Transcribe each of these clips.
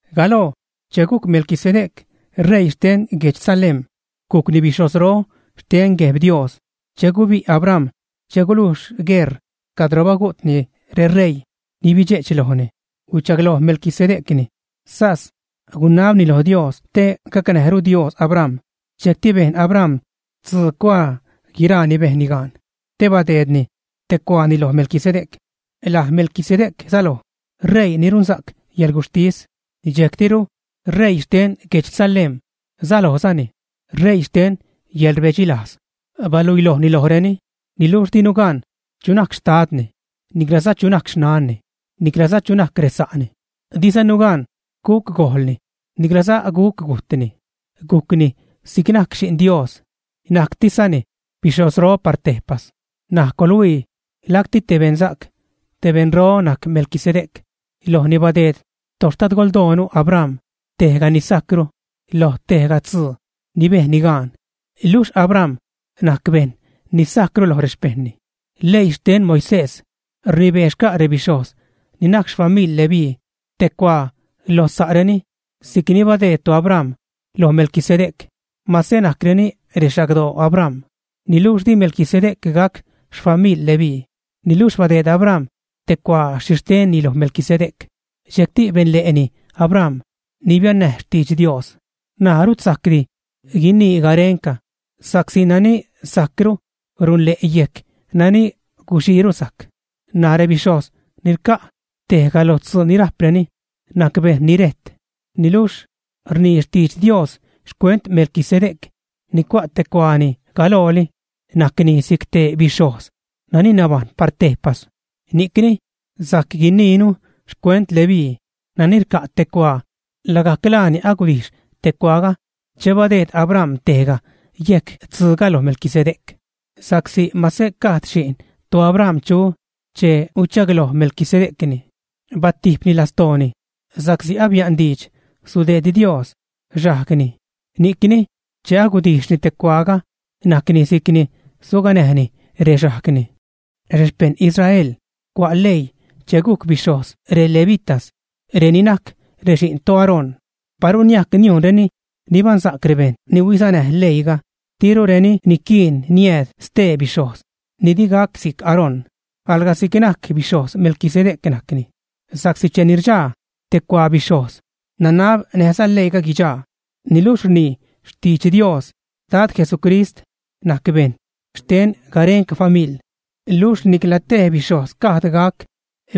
Galoo che gujc Melquisedec ṟeii xten guedx Salem, gujcni bixhojzro xten Gueb Dios. Che gubi' Abram che gulujx gueṟ cadro bagu'tni reṟeii ni bidxe'ch lojni, huichagloj Melquisedecni, sas gunabni lo Dios te gacnäjru Dios Abram. Dxejcti bejn Abram tzuu cuaa guiraa ni bejnni gaan, te badeedni tej cuaani loj Melquisedec. Laj Melquisedec säloj “ṟeii ni runsa'c yäḻguxhtis”, dxejctiru ṟeii xten guedx Salem sälojzani “ṟeii xten yäḻrbedxilajz”. Baluiilojni lojreni, niluxh dinu gan chu najc xtadni, niclaza chu najc xnanni, niclaza chu najc resa'ni. Dizanu gan guc gojlni niclaza guc gujtni. Gujcni si'c najc Xi'n Dios. Najctiszani bixhojzro par tejpas. N̲aj coḻhuii, lacti te beṉsa'c, te beṉro najc Melquisedec. Lojni badeed toxtadgoldoonu Abram tejga ni sajcru lo tejga tzuu ni bejnni gaan. Luxh Abram najc bejṉ ni sajcru lo rexpejṉni. Leii xten Moisés, rnibee xca' rebixhojz ni najc xfamiḻ Leví te cuaa lo sa'reni si'c ni badeed toAbram loj Melquisedec, mase najcreni rexagdoo Abram. Niluxh di Melquisedec gac xfamiḻ Leví. Niluxh badeed Abram te cuaa xhixtenni loj Melquisedec. Dxejcti benle'ni Abram ni biannäj xtidx Dios. N̲aj rut sajcdi guinii garenca, sa'csi nani sajcru runle' yejc nani guxiiru sajc. N̲aj rebixhojz ni rca' tejga lo tzuu ni rajpreni, najc bejṉ ni rejt. Niluxh rnii xtidx Dios xcuent Melquisedec ni cua' te cuaani galooli: najcni si'c te bixhojz nani nabajṉ par tejpas. Ni'cni sajc guiniinu xcuent Leví nani rca' te cuaa, lagajc laani agudijx te cuaaga che badeed Abram tejga yejc tzuuga lo Melquisedec. Sa'csi mase gajd xi'n toAbram chu che huichagloj Melquisedecni, batijpni lastooni sa'csi abia'n diidx sudeed Dios xajgni. Ni'cni che agudijxni te cuaaga najcni si'cni suganäjni rexajgni. Rexpejṉ Israel cua' leii che gujc bixhojz relevitas, reni najc rexi'n toAarón. Paru niajc niujnreni nibaṉsa'c rebejṉ ni huisanäj leiiga, dirureni niquiin niääd stee bixhojz ni di gac si'c Aarón, alga si'c najc bixhojz Melquisedec najcni. Sa'csi cheni rdxaa te cuaa bixhojz nanab näjza leiiga guidxaa. Niluxh rnii xtidx Dios, Dad Jesucrist najc bejṉ xten garenca famiḻ. Luxh nicla tej bixhojz gajd gac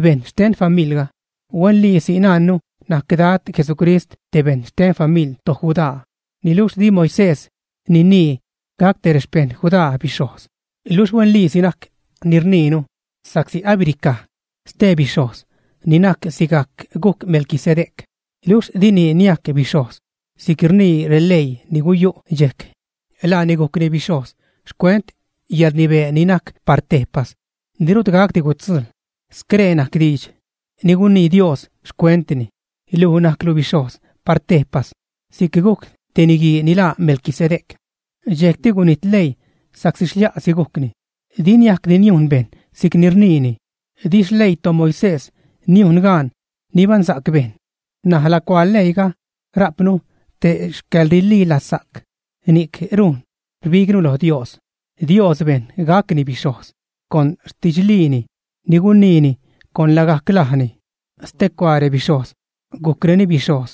bejṉ xten famiḻga. Huenliisi najnnu najc Dad Jesucrist te bejṉ xten xfamiḻ toJudá, niluxh di Moisés ninii gac te rexpejṉ Judá bixhojz. Luxh huenliisi najc ni rniinu, sa'csi abiricaj ste bixhojz ni najc sigajc gujc Melquisedec. Luxh dini niajc bixhojz si'c rnii releii ni guyu' dxejc. Laani gujcni bixhojz xcuent yäḻrnibee ni najc par tejpas, ni rut gacdi gutzujḻ. Scree najc diidx ni gunii Dios xcuentni: Luj najclu bixhojz par tejpas si'c gujc te niguii ni laa Melquisedec. Dxejcti gunijt leii sa'csi xlia'si gujcni, di niajcdi niujn bejṉ si'cni rniini. Di xleii toMoisés niujn gaan nibaṉsa'c bejṉ. N̲aj lacuaa leiiga rajpnu te xcäḻrililazsa'c; ni'c rujn rbignu lo Dios. Dios bejn gacni bixhojz con xtidxliini, ni guniini con lagajc lajni. Stecuaa rebixhojz gujcreni bixhojz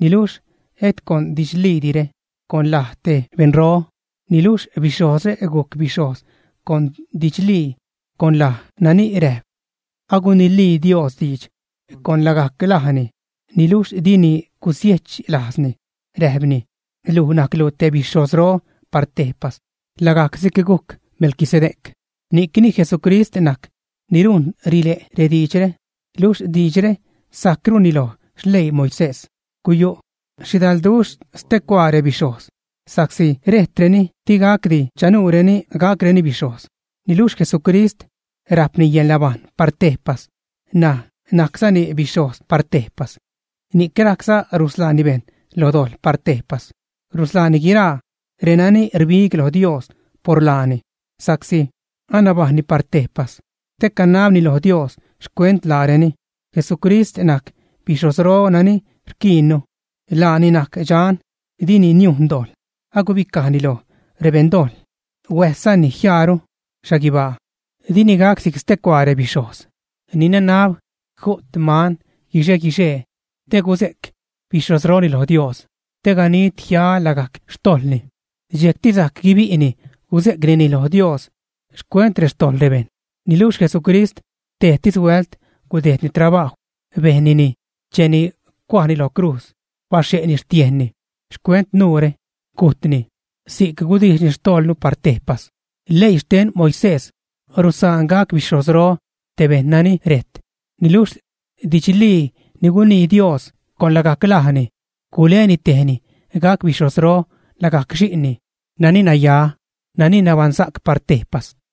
niluxh et con didxliidire, con laj te beṉro, niluxh bixhojzre guc bixhojz con didxlii, con laj nani räjp: Agunilii Dios diidx con lagajc lajni, niluxh dini gusiech lajzni, räjpni: “Luj najclu te bixhojzro par tejpas, lagajc si'c gujc Melquisedec.” Ni'cni, Jesucrist najc ni rujn rile' rediidxre, luxh diidxre sajcruni loj xleii Moisés. Guyu' xhidalduxh stecuaa rebixhojz, sa'csi rejtreni, digacdi chanuureni gacreni bixhojz. Niluxh Jesucrist rajpni yäḻnabajṉ par tejpas, ṉaj najczani bixhojz par tejpas. Ni'c rajcza rusḻaani bejṉ lo dojḻ par tejpas. Rusḻaani guiraa renani rbig lo Dios por laani, sa'csi anabajṉni par tejpas te canabni lo Dios xcuent laareni. Jesucrist najc bixhojzro nani rquiinnu. Laani najc dxan, dini niujn dojḻ, agubicajni lo rebeṉ-dojḻ, huäjszani jiaaru xhaguibaa. Dini gac si'c stecuaa rebixhojz ni nanab ju't man guixe-guixee te guze'c bixhojzroni lo Dios te ganid jiaa lagajc xtojḻni. Dxejcti sajc guibi'ni guze'cnini lo Dios xcuent xtojḻ rebejṉ. Niluxh Jesucrist tejtis huält gudejdni trabajw, bejnnini cheni cuajni lo crujz, baxhe'ni xtiejnni xcuent nuure, gujtni. Si'c gudijxni xtojḻnu par tejpas. Leii xten Moisés rusaan gac bixhojzro te bejṉ nani rejt, niluxh didxlii ni gunii Dios con lagajc lajni guleni tejni gac bixhojzro lagajc Xi'nni nani naya, nani nabaṉsa'c par tejpas.